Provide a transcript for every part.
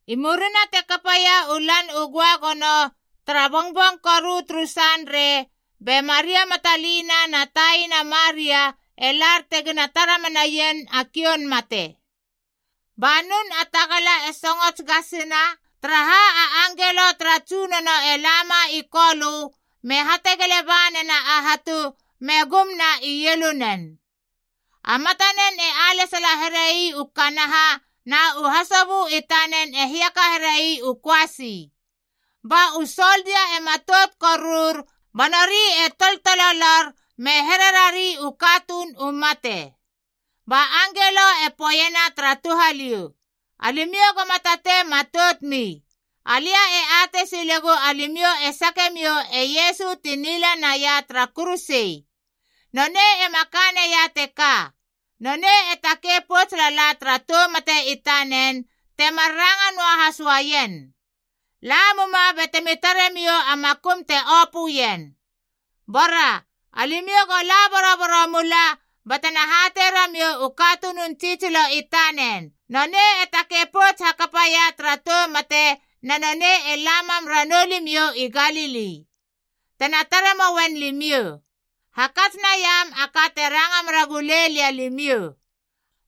I murina te kapaia u Lan u Göagono, tara bongbong koru turu Sanrei, be Maria Matalina na taina Maria e lar tegina tara menaien a kioun mate. Ba nun a tagala e songots gasina, taraha a angelo tara Tsunono e lama i Kolö me hategele ba nena a hatu, me gumna ielunen. A matanen e alesala herei u kanaha, na u hasobö i tanen e hiaka herei u köasi. Ba u soldia e matout korur ba nori e toltololor me hererari u katuun u mate. Ba angelo e poeiena tara touhaliou, “Alimiou goma tatei matoutmi. Alia e atei silegu alimiou e sake miou e Iesu ti nila naia tara kuruse. Nonei ema ka neia teka. Nonei e takei pouts lala tara tou mate i tanen, temar ranga noahas uaien. La muma batemi taremiou a makum te opöien. Bora alimiou go la boroboro mula batena hatei ramiou u katunun tsitsilo i tanen, ‘Nonei e takei pouts hakapaia tara tou mate, na nonei e la mam ranou limiou i Galili. Tena tare moien limiou.’ Hakats naiam a ka te ranga mera gulei lia limiou.”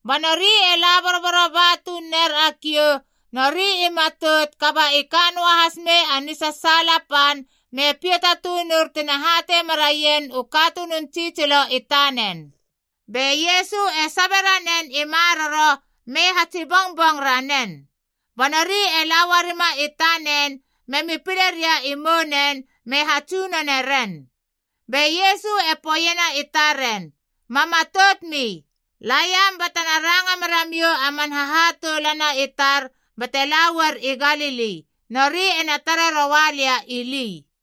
Ba nori e la boroboro ba tuun ner a kiou, nori i matout kaba i ka noahas mei a nisasaala pan, me piata tunur tina hatei meraien u katunun tsitsilo i tanen. Be Iesu e sabe ranen i maroro me hatsi bongbong ranen. Ba nori e la uarima i tanen, memi pile ria i mounen me hatsunone ren. Be Iesu e poeiena i taren, “Ma matoutmi. La iam batena ranga meramiou a man hahatoulana i tar bate la uar i Galili, nori ena tare roa lia ili.”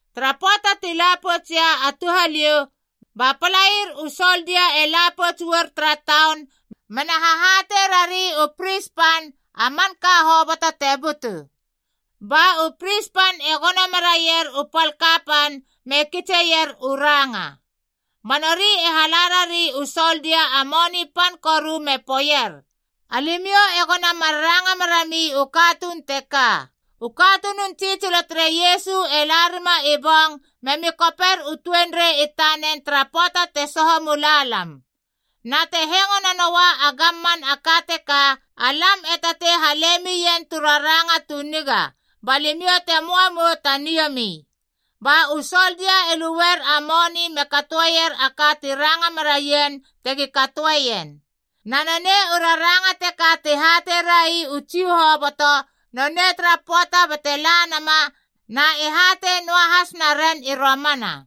Tara pöata ti la poutsia a touhaliou, ba a palair u soldia e la pouts uar tara taun mena hahatei rari u pris pan a manka hoboto te butu. Ba u pris pan e gono meraier u pal kapan me kitseier u ranga. Ba nori e hala rari u soldia a moni pan koru me poeier, “Alimiou egona mar ranga merami u katuun teka, ‘U katunun tsitsilo tere Iesu e la rima i bong memi koper u tuenrei i tanen tara pöata te soho mula lam.’ Na te hengo nanoa a gamman a ka teka, alam e tatei hale mien tu raranga tu niga, ba limiou te möa mou ta niomi.” Ba u soldia e lueier a moni me katoer a ka ti ranga meraien tegi katoeien. Na nonei u raranga teka ti hatei rai u Jiu hoboto nonei tara pöata bate la nama na e hatei noahas naren i romana.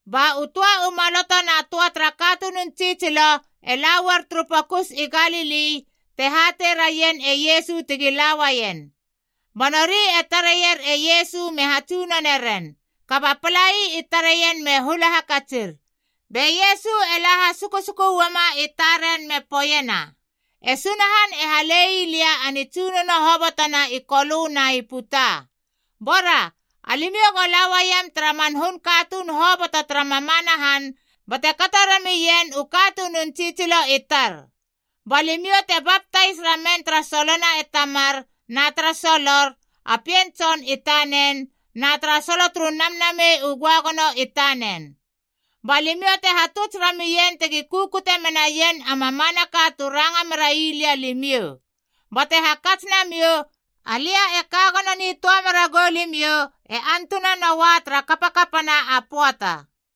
Ba u töa u maloto na töa tara katunun tsitsilo e la uar turu pokus i Galili te hatei raien e Iesu tegi la uaien. Ba nori e tareier e Iesu me hatsunone ren, kaba palai i tareien me hula hakatsir. Be Iesu e la hasukusuku uama i taren me poeiena, “E Sunahan e halei lia a nitsunono hobotona i Kolö na i puta. Bora, alimiou go la uaiam tara man hun katuun hoboto tara mamana han bate kato ramien u katunun tsitsilo i tar. Ba limiou te baptais ramen tara solona e Tamar na tara solor, a Pien Tson i tanen, na tara solo turu Namnamei u Göagono i tanen. Ba limiou te hatuts ramien tegi kukute menaien a mamanaka tu ranga merai lia limiou. Bate hakats namiou: alia e ka gono nitöa mera gou limiou e antunanoa tara kapakapana a pöata.”